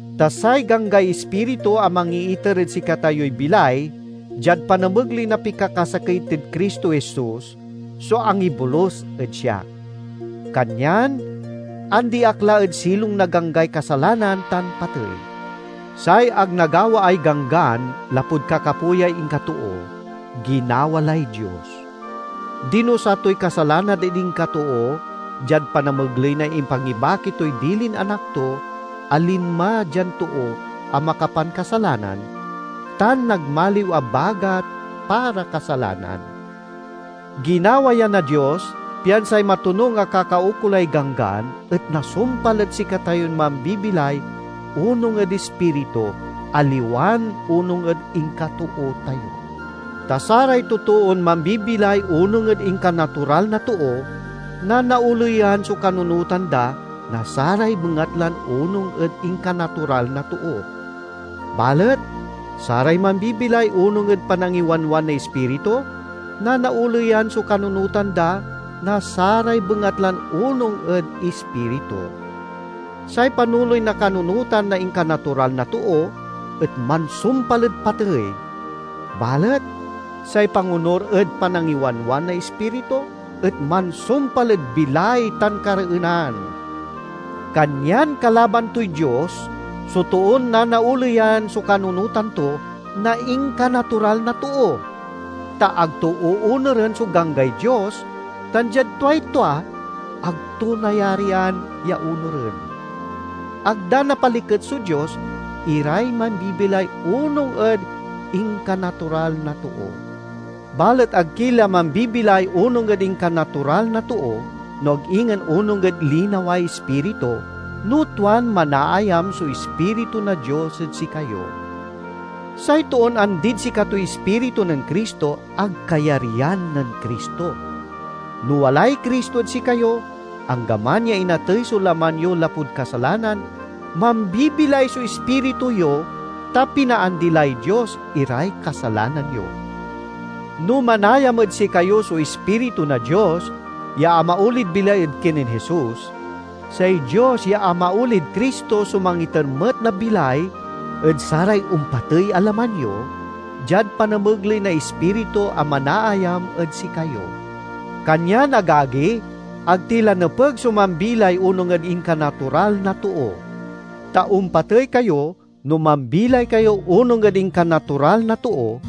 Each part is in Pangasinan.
Ta say ganggay Ispiritu, a mangiiter ed sikatayoy bilay diad panamegley na pikakasakey tid Cristo Jesus, so angibolus ed siak. Kanyan andi ak la ed silong na ganggay kasalanan tan patey. Say ag nagawaay Ganggan lapud kakapoyay inkatoo, ginawa lay Dios. Dinusa toy kasalanan ed inkatoo diad panamegley na impangibaki toy dilin Anak to a linma dian too a makapankasalanan, tan nagmaliw a bagat para kasalanan. Ginaway ya na Dios, pian say matonung a kakaukolay Ganggan et nasumpal ed sikatayon mambibilay onung ed Ispiritu, aliwan onung ed inkatoo tayo. Ta saray totoon mambibilay onung ed inkanatural na too nanaoleyan so kanunotan da na saray bengatlan onung ed inkanatural na too. Balet saray mambibilay onung ed panangiwanwan na Ispiritu, nanaoleyan so kanunotan da na saray bengatlan onung ed Ispiritu. Say panoley na kanunotan na inkanatural na too et mansumpal ed patey, balet say pangonur ed panangiwanwan na Ispiritu et mansumpal ed bilay tan kareenan. Kanyan kalaban toy Dios so toon nanaoleyan so kanunotan to na inkanatural na too, ta ag to oonuren so ganggay Dios tan diad tuay tua, ag to nayarian ya onuren. Ag da napaliket so Dios iray mambibilay onung ed inkanatural na too. Balet ag ki la mambibilay onung ed inkanatural na too, no ag ingen onung ed linaway Ispiritu, no tuan manaayam so Ispiritu na Dios ed sikayo. Say toon andid sikatoy Ispiritu nen Cristo, ag kayaryan nen Cristo. No walay Cristo ed sikayo, anggaman ya inatey so laman yo lapud kasalanan, mambibilay so ispiritu yo, ta pinaandi lay Dios iray kasalanan yo. No manayam ed sikayo so Ispiritu na Dios ya amaolid bilay ed kinen Jesus, say Dios ya amaolid Cristo so mangiter met na bilay ed saray ompatey a laman yo, diad panamegley na Ispiritu a manaayam ed sikayo. Kanyan, agagi, ag ti la nepeg so mambilay onung ed inkanatural na too. Ta ompatey kayo no mambilay kayo onung ed inkanatural na too,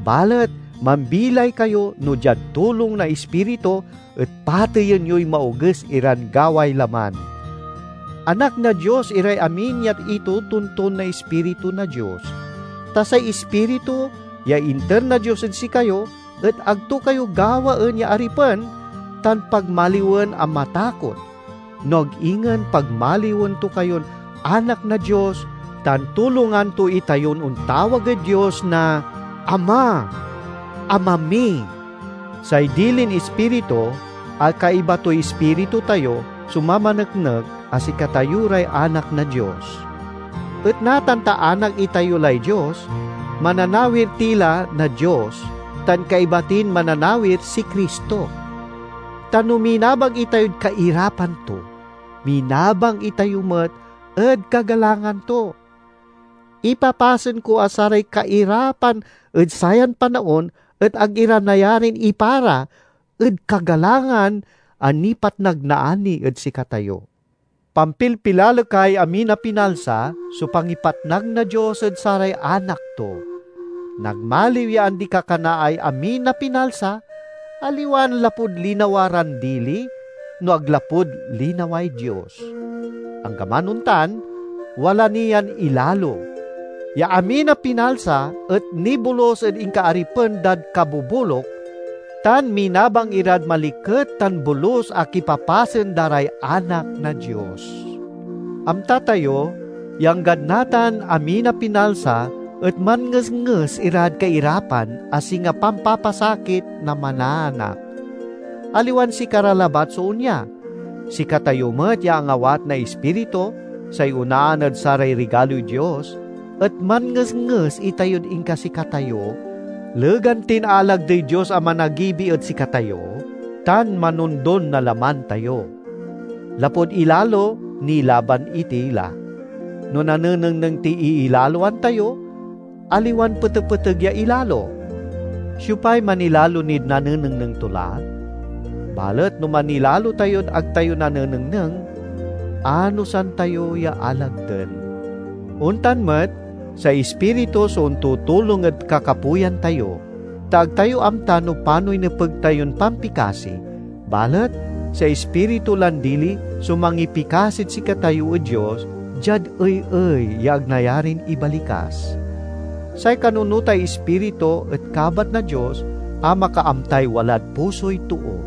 balet mambilay kayo no diad tulong na Ispiritu et pateyen yoy maoges iran gaway laman. Anak na Dios iray amin ya itotonton na Ispiritu na Dios. Ta say Ispiritu ya inter na Dios ed sikayo et ag to kayo gawaen ya aripen tan pagmaliwen a matakot, no ag ingen pagmaliwen to kayon anak na Dios tan tulongan to itayon ontawag ed Dios na "Ama! Ama mi!" Say dilin Ispiritu, a kaiba toy ispiritu tayo, so mamaneknek a sikatayo ray anak na Dios. Et natan ta anak itayo lay Dios, mananawir ti la na Dios tan kaiba tin mananawir si Cristo. Ta no minabang itayod kairapan to, minabang itayo met ed kagalangan to. Ipapasen ko a saray kairapan ed sayan panaon et ag ira nayarin ipara ed kagalangan a nipatnag naani ed sikatayo. Pampilpilalekay amin a pinalsa so pangipatnag na Dios ed saray anak to. Nagmaliw ya andi-kakanaay amin a pinalsa, aliwan lapud linawa ran dili, no ag lapud linaway Dios. Anggaman ontan, wala ni yan ilalo, ya amin a pinalsa et nibolus ed inkaaripen dad kaboboluk, tan minabang irad maliket tan bolus a kipapasen da ray anak na Dios. Amta tayo ya anggad natan, amin a pinalsa et manngesnges irad kairapan a singa pampapasakit na manaanak. Aliwan sikara labat so onya; sikatayo met ya angawat na Ispiritu, say onaan ed saray rigaloy Dios, et manngesnges itayod inkasikatayo, legan tin aalagdey Dios a managibi ed sikatayo tan manondon na laman tayo. Lapud ilalo nilaban iti la. No nanenengneng tiy iilaloan tayo, aliwan petepeteg ya ilalo. Siopay manilalo nid nanenengneng to la? Balet no manilalo tayod ag tayo nanenengneng, anosan tayo ya alagden. Ontan met, say Ispiritu so ontutulong ed kakapoyan tayo. Ta ag tayo amta no panoy nepeg tayon pampikasi, balet say Ispiritu lan dili so mangipikasid sikatayo ed Dios, diad ey-ey ya ag nayarin ibalikas. Say kanunotay Ispiritu et kabat na Dios a makaamtay walad pusoy too;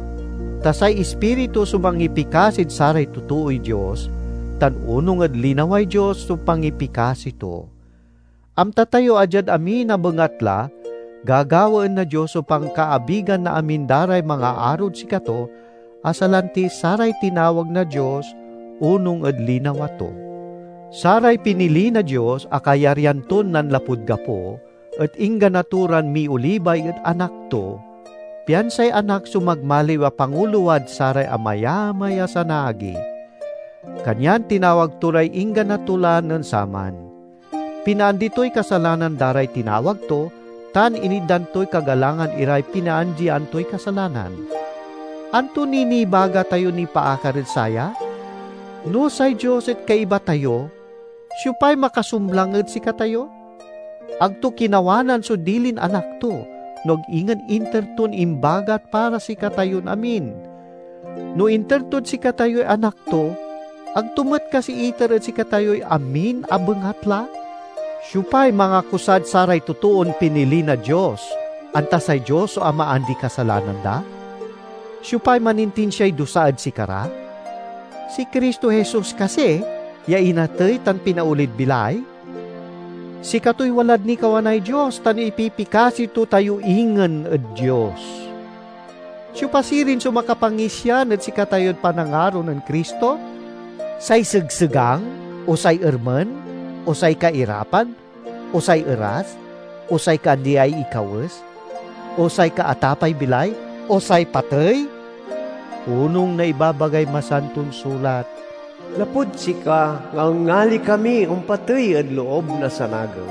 ta say Ispiritu so mangipikasid saray totooy Dios tan onung ed linaway Dios so pangipikasi to. Amta tayo a diad amin a bengatla gagawaen na Dios so pankaabigan na amin da ray mangaarod sikato, a salanti saray tinawag na Dios onung ed linawa to. Saray pinili na Dios a kayaryan ton nanlapud gapo et inggana to ran miolibay ed Anak to, pian say Anak so magmaliw a pangulowad saray amayamay a sanaagi. Kanyan tinawag to ray inggana to la nen saman. Pinaandi toy kasalanan da ray tinawag to, tan initdan toy kagalangan iray pinaandian toy kasalanan. Anto niy nibaga tayo nipaakar ed saya? No say Dios et kaiba tayo, siopay makasumlang ed sikatayo? Ag to kinawanan so dilin Anak to, no ag ingen inter ton imbagat para sikatayon amin! No inter tod sikatayoy Anak to, ag to met kasi iter ed sikatayoy amin a bengatla? Siopay mangakusad saray totoon pinili na Dios, anta say Dios so amaandiy kasalanan da? Siopay manintinsiay dusa ed sikara? Si Cristo Jesus kasi, ya inatey tan pinaolid bilay? Sikatoy walad nikawanay Dios tan ipipikasi to tayo ingen ed Dios! Siopa sirin so makapangisian ed sikatayod panangaro nen Cristo? Say segsegang, o say ermen, o say kairapan, o say eras, o say kaandiay ikawes, o say kaatapay bilay, o say patey? Onung na ibabagay Masanton Sulat, "Lapud sika, ngalngali kami ompatey ed loob na sanagew;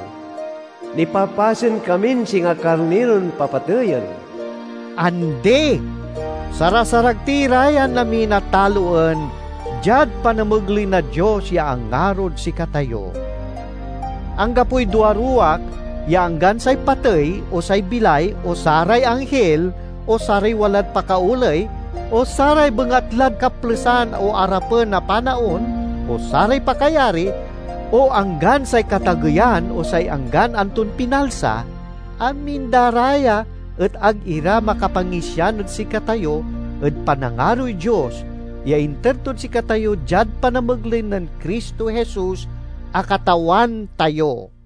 nipapasen kamin singa karniron papatayen." Andi! Sarasarag ti ra yan amin a taloen diad panamegley na Dios ya angarod sikatayo! Anggapoy duaruwak ya anggan say patey, o say bilay, o saray anghil, o saray walad pakaoley, o saray bengatlad kaplesan o arapen a panaon, o saray pakayari, o anggan say katageyan, o say anggan anton pinalsa—amin da ra ya et ag ira makapangisian ed sikatayo ed panangaroy Dios ya inter tod sikatayo diad panamegley nen Cristo Jesus a Katawan tayo.